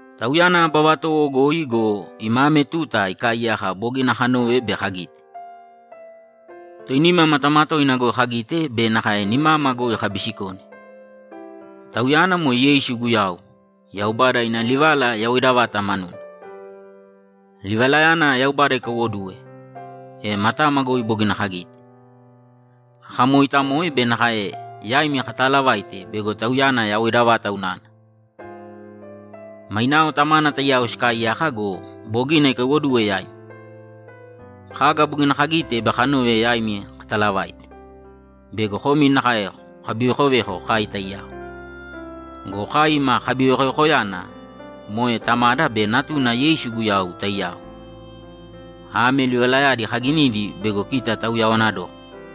Tauyana aba vatowo goi go, ima ame tuta ikaaiyaka bogina kanove be kagite. Toinima matama toina goi kagite be nakae nimama goi kabisikone. Tauyana moe Yeisu Guyau, Yaubada ina Livala yawoida vata manuna. Livalayana Yaubada ikaiwoduwe, e matama goi bogina kagite, kakamooitamoe be nakae yaimi kataalavaite bego Tauyana yawoida vata unana. Mainao Tamana taiyao sikaaiyaka go, bogina ikaiwoduwe yaima. Kaga bogina kagite be kanove yaimi kataalavaite bego komi nakae kokabivekoveko kai taiyao. Go kai ima kabivekovekoyana moe Tamada be Natuna Yeisu Guyau taiyao. Ame livalayadi kaginidi bego kita tauyawana dókana.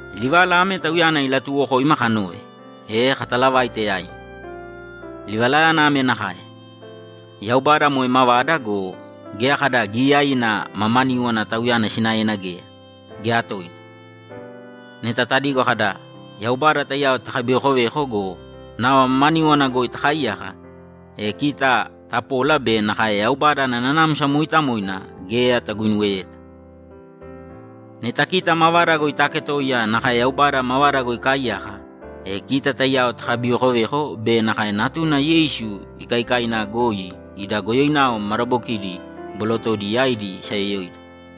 Livala ame Tauyana ilatuuwokoima kanove, e kataalavaite yaimi. Livalayana ame nakae: Yaubada moe mavada go, geya kada giyaiina mamaníwana Tauyana sinaena geya, geya toina. Neta tadigo kada, ‘Yaubada taiyao takabivekoveko’ go, nava mamaníwana goi takaaiyaka, e kita tapola be nakae Yaubada ana Nanamsa Mooitamoina geya taguinuweyeta. Neta kita mavada goi taaketoiya nakae Yaubada mavada goi ikaaiyaka, e kita taiyao takabivekoveko be nakae Natuna Yeisu ikaikaina goi ida goyoinao madabokidi bolotodi yaidi isayoyoida.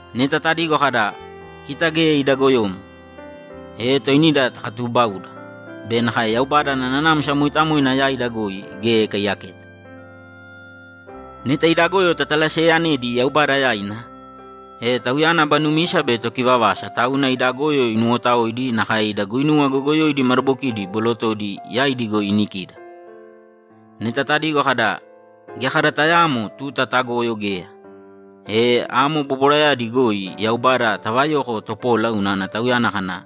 Neta tadigo kada, ‘Kita geya ida goyomo’, e toinida takatuubauda be nakae Yaubada ana Nanamsa Mooitamoina yaida goi geya ikaiyaketa. Neta ida goyo tatalaseeyanedi Yaubada yaina, e Tauyana aba numisa be tokivavasa tauna ida goyo inuwotaoidi nakae ida guinuwa goyogoyoidi madabokidi bolotodi yaidi goi inikida. Neta tadigo kada, ‘Geya kada tayaamo tuta tagoyo geya’, e amo bobwarayadi goi Yaubada tavayoko topola unana Tauyana kana,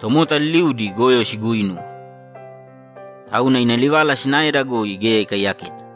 ‘Tomota liliudi goyo siguuinuwe.’ Tauna ina livala sinaeda goi geya ikaiyaketa.